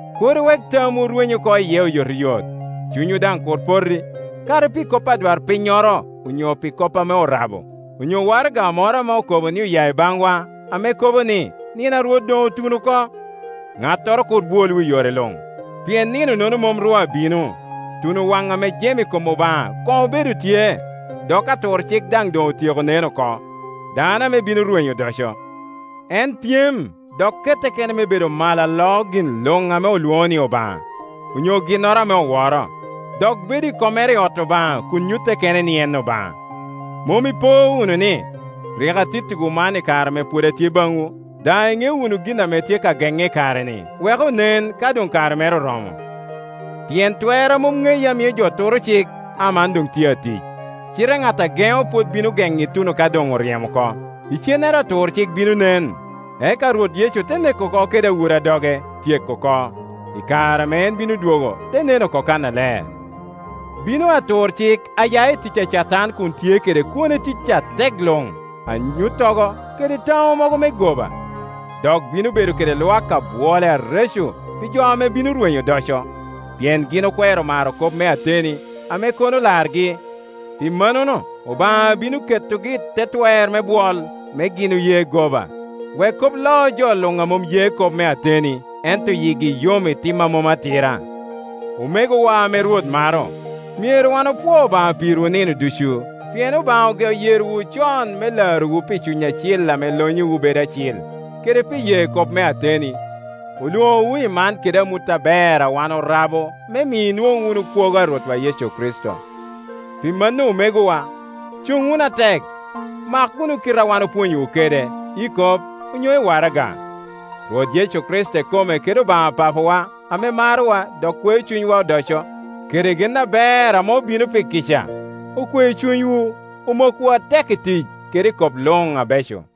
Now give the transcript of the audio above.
kur iwek tamwu rweny oko iye oyotoyot, cunywu daŋ kur poti, kadi pi kop adwarpinnyoro onyo pi kop ame orabo, onyo waraga moro ame okobo ni oya i baŋwa, ame kobo ni, nino a Rwot doŋ otuno oko. Ŋattoro kur bwolwu i yore luŋ, pien nino-nono mom ru abino, tuno waŋ ame jem i kom Obaŋa koŋ obedo tye, dok aturcik daŋ doŋ otyeko nen oko, dano ame bino rwenyo odoco. En pyem, dok kette kene me bedo malo aloo gin luŋ ame olwoŋo ni Obaŋa, onyo ginnoro ame oworo; dok bedo i kommere i ot Obaŋa kun nyutte kene ni en Obaŋa. Mom ipo wunu ni, rik atittiwu man i kare ame pwod atye baŋwu? Daŋ iŋeo wunu gin ame tye ka geŋe i kare-ni, wek onen ka doŋ kare mere oromo. Pien twer a mom ŋeye ame mio jo turo cik aman tye doŋ atic; cite ŋat a geŋo pwod bino geŋo ituno ka doŋ oryemo oko. Icennere aturcik bino nen, eka Rwot Yecu te neko oko kede awura doge, tyeko oko, i kare ame en bino dwogo te nen oko kannaler. Bino aturcik aya i tic Catan kun tye kede kwone tic atek luŋ, anyuttogo kede taŋo mogo me goba. Dok bino bedo kede lwak abwole areco pi jo ame bino rwenyo odoco, pien gin okwero maro kop me ateni ame kono largi. Pi mannono Obaŋa bino ketogi i te twer me bwol, me gin oye goba, wek kop lo jo luŋ a mom ye kop me ateni, ento yigi yom i tim a mom atira. Omegowa ame Rwot maro, myero wan opwo Obaŋa pirwu nino ducu, pien Obaŋa ogeo yerowu con me larowu pi Cuny Acil ame lonyowu bedo acil, kede pi ye kop me ateni. Olwoŋowu i man kede amut aber a wan orabo me mi inwoŋ wunu kwogo a Rwotwa Yecu Kricito. Pi mano omegowa, cuŋ wunu atek, mak wunu kite a wan opwonyowu kede, i kop onyo i waraga. Rwot Yecu Kricito ikome kede Obaŋa Papawa ame marowa dok kweo cunywa odoco kede gen aber ame obino pi kica, okwe cunywu, omokwu atek i tic kede i kop luŋ abeco.